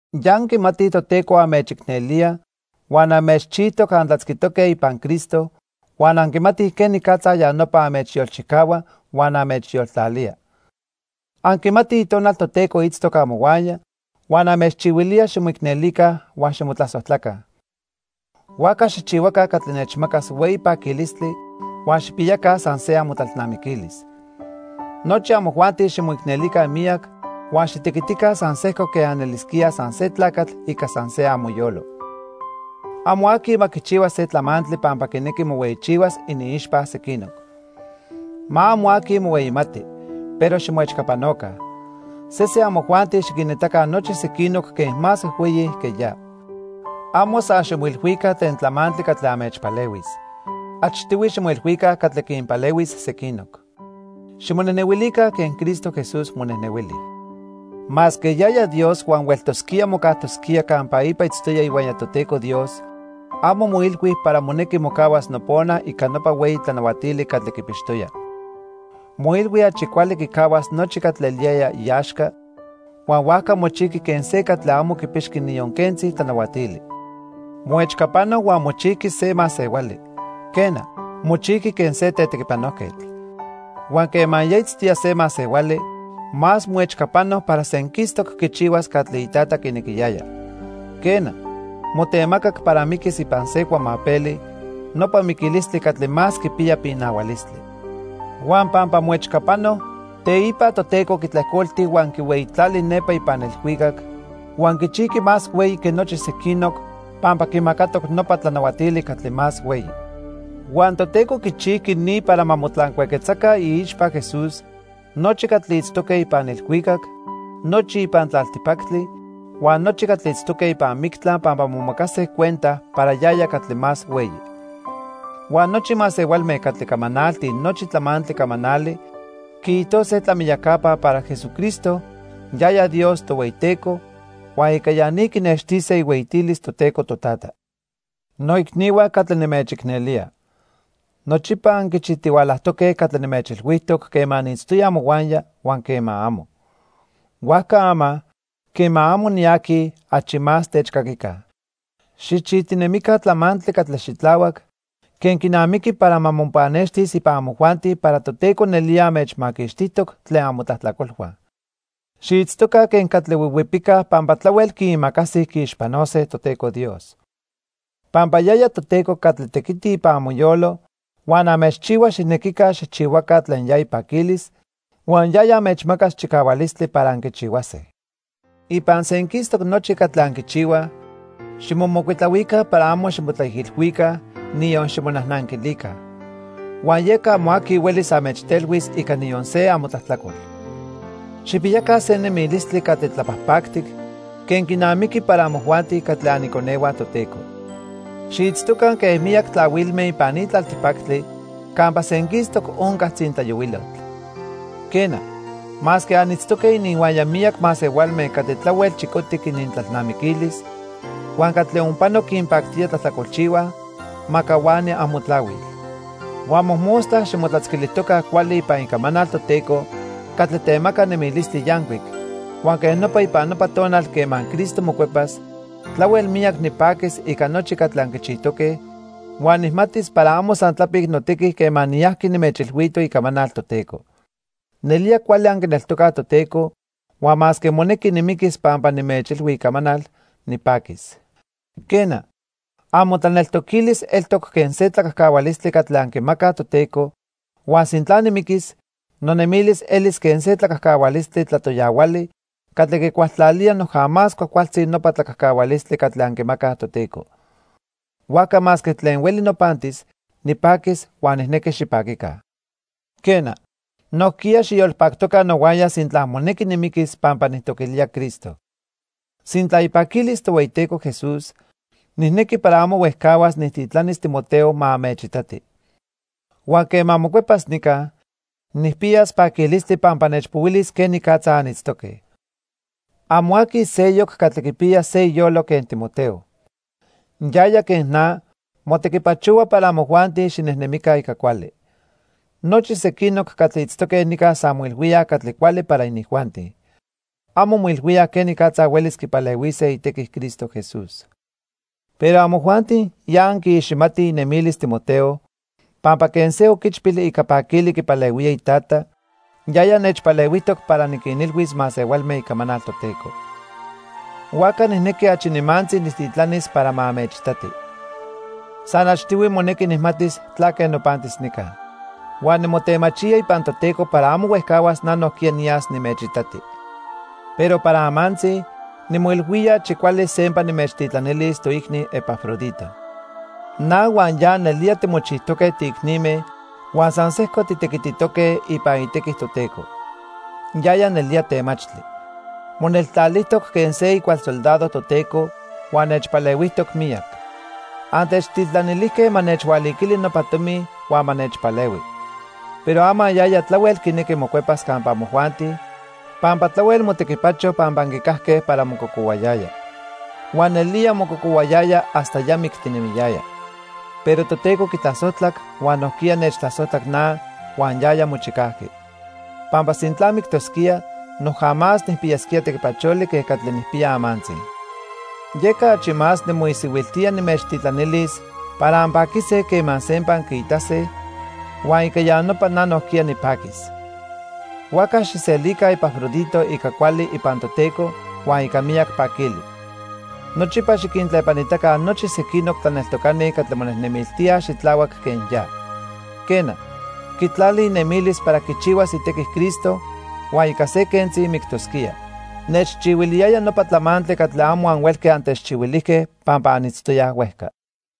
Ya anquimatij Toteco anmechicnelía huan anmechchijtoc antlatzquitoque ipan Cristo, huan anquimatij quenicatza ya nopa anmechyolchicahua huan anmechyoltlalía. Anquimatij Itonal Toteco itztoc amohuaya huan anmechchihuilía ximoicnelica huan ximotlasojtlaca. Huajca xijchihuaca catli nechmacas hueyi paquilistli huan xijpiyaca san se amotlalnamiquilis. Nochi amojuanti ximoicnelica miyac huan xitequitica san sejco quen anelisquíaj san se tlacatl ica san se amoyolo. Amo aqui ma quichihua se tlamantli pampa quinequi mohueyichihuas iniixpa sequinoc. Ma amo aqui mohueyimati, pero ximoechcapanoca. Sesen amojuanti xiquinitaca nochi sequinoc quen más huejhueyi que ya. Amo san ximoilhuica tlen tlamantli catli anmechpalehuis. Achtihui ximoilhuica catli quinpalehuis sequinoc. Ximonejnehuilica quen Cristo Jesús monejnehuili. Masque yaya Dios huan hueltosquía mocajtosquía campa ipa itztoya ihuaya Toteco Dios, amo moilhui para monequi mocahuas nopona ica nopa hueyi tlanahuatili catli quipixtoya. Moilhui achi cuali quicahuas nochi catli eliyaya iaxca, huan huajca mochijqui quen se catli amo quipixqui niyon quentzi tlanahuatili. Moechcapano huan mochijqui se masehuali, quena, mochijqui quen se tetequipanojquetl. Huan quema ya itztoya se masehuali, más moechcapano para senquistoc quichihuas catli iTata quinequiyaya. Quena, motemacac para miquis ipan se cuamapeli, nopa miquilistli catli más quipiya pinahualistli. Huan pampa moechcapano, teipa Toteco quitlejcolti huan quihueyitlali nepa ipan ilhuicac huan quichijqui más hueyi que nochi sequinoc pampa quimacatoc nopa tlanahuatili catli más hueyi. Huan Toteco quichijqui ni para ma motlancuaquetzaca iixpa Jesús nochi catli itztoque ipan ilhuicac, nochi ipan tlaltipactli huan nochi catli itztoque ipan mictla pampa momacase cuenta para yaya catli más hueyi. Huan nochi masehualme catli camanaltij nochi tlamantli camanali quiijtose tlamiyacapa para Jesucristo, yaya Dios Tohueyiteco, huan ica ya ni quinextise ihueyitilis Toteco Totata. Noicnihua catli nimechicnelía, nochipa anquichijtihualajtoque catli nimechilhuijtoc quema niitztoya amohuaya huan quema amo. Huajca ama, quema amo niaqui, achi más techcaquica. Xijchijtinemica tlamantli catli xitlahuac quen quinamiqui para ma mopannextis ipan amojuanti para Toteco nelía anmechmaquixtijtoc tlen amotlajtlacolhua. Xiitztoca quen catli huihuipicaj pampa tlahuel quiimacasij quiixpanose Toteco Dios. Pampa yaya Toteco catli tequiti ipan amoyolo huan anmechchihua xijnequica xijchihuaca tlen ya ipaquilis, huan yaya anmechmacas chicahualistli para anquichihuase. Ipan senquistoc nochi catli anquichihuaj ximomocuitlahuica para amo ximotlaijilhuica, niyon ximonajnanquilica. Huan yeca amo aqui huelis anmechtelhuis ica niyon se amotlajtlacol. Xijpiyaca se nemilistli catli tlapajpactic quen quinamiqui para amojuanti catli aniconehua Toteco. Xiitztoca quen miyac tlahuilme ipan ni tlaltipactli campa senquistoc onca tzintlayohuilotl. Quena, masque anitztoque ininhuaya miyac masehualme catli tlahuel chicotic inintlalnamiquilis huan catli onpano quinpactía tlajtlacolchihuaj, ma cahuani amotlahuil. Huan mojmostla ximotlatzquilijtoca cuali ipan icamanal Toteco catli temaca nemilistli yancuic, huan quej nopa ipan nopa tonal quema Cristo mocuepas, tlahuel miyac nipaquis ica nochi catli anquichijtoque, huan nijmatis para amo san tlapic notequi quema niyajqui nimechilhuito icamanal Toteco. Nelía cuali anquineltocaj Toteco huan masque monequi nimiquis pampa nimechilhui icamanal, nipaquis. Quena, amotlaneltoquilis eltoc quen se tlacajcahualistli catli anquimacaj Toteco huan sintla nimiquis, nonemilis elis quen se tlacajcahualistli tlatoyahuali catli quicualtlalía noja más cuajcualtzi nopa tlacajcahualistli catli anquimacaj Toteco. Huajca masque tlen hueli nopantis, nipaquis huan nijnequi xipaquica. Quena, nojquiya xiyolpactoca nohuaya sintla monequi nimiquis pampa nijtoquilía Cristo. Sintla ipaquilis Tohueyiteco Jesús, nijnequi para amo huejcahuas nijtitlanis Timoteo ma anmechitati. Huan quema mocuepas nica, nijpiyas paquilistli pampa nechpohuilis quenicatza anitztoque. Amo aqui seyoc catli quipiya se iyolo quen Timoteo. Yaya, quen na, motequipachohua para amojuanti xinejnemica ica cuali. Nochi sequinoc catli itztoque nica san moilhuíaj catli cuali para inijuanti. Amo moilhuíaj quenicatza huelis quipalehuise itequi Cristo Jesús. Pero amojuanti ya anquiiximatij inemilis Timoteo pampa quen se oquichpil ica paquili quipalehuía itata, yaya nechpalehuijtoc para niquinilhuis masehualme icamanal Toteco. Huajca nijnequi achi nimantzi nijtitlanis para ma anmechitati. San achtihui monequi nijmatis tlaque nopantis nica. Huan nimotemachía ipan Toteco para amo huejcahuas na nojquiya niyas nimechitati. Pero para amantzi, nimoilhuía achi cuali sempa nimechtitlanilis toicni Epafrodito. Na huan ya nelía timochijtoque tiicnime huan san sejco titequititoque ipan itequi Toteco. Yaya nelía temachtli. Moneltlalijtoc quen se icual soldado Toteco huan nechpalehuijtoc miyac. Antechtitlanilijque ma nechhualiquili nopa tomi huan ma nechpalehui. Pero ama yaya tlahuel quinequi mocuepas campa amojuanti pampa tlahuel motequipacho pampa anquicajque para mococohuayaya. Huan nelía mococohuayaya hasta ya mictinemiyaya. Pero Toteco quitlasojtlac huan nojquiya nechtlasojtlac na huan yaya mochicajqui. Pampa sintla mictosquía, noja más nijpiyasquía tequipacholi que catli nijpiya amantzi. Yeca achi más nimoisihuiltía nimechtitlanilis para anpaquise quema sempa anquiitase, huan ica ya nopa na nojquiya nipaquis. Huajca xijselica Epafrodito ica cuali ipan Toteco huan ica miyac paquili. Nochipa xiquintlepanitaca nochi sequinoc tlaneltocani catli monejnemiltíaj xitlahuac quen ya. Quena, quitlali inemilis para quichihuas itequi Cristo huan ica se quentzi mictosquía. Nechchihuiliyaya nopa tlamantli catli amo anhuelque antechchihuilijque pampa anitztoyaj huejca.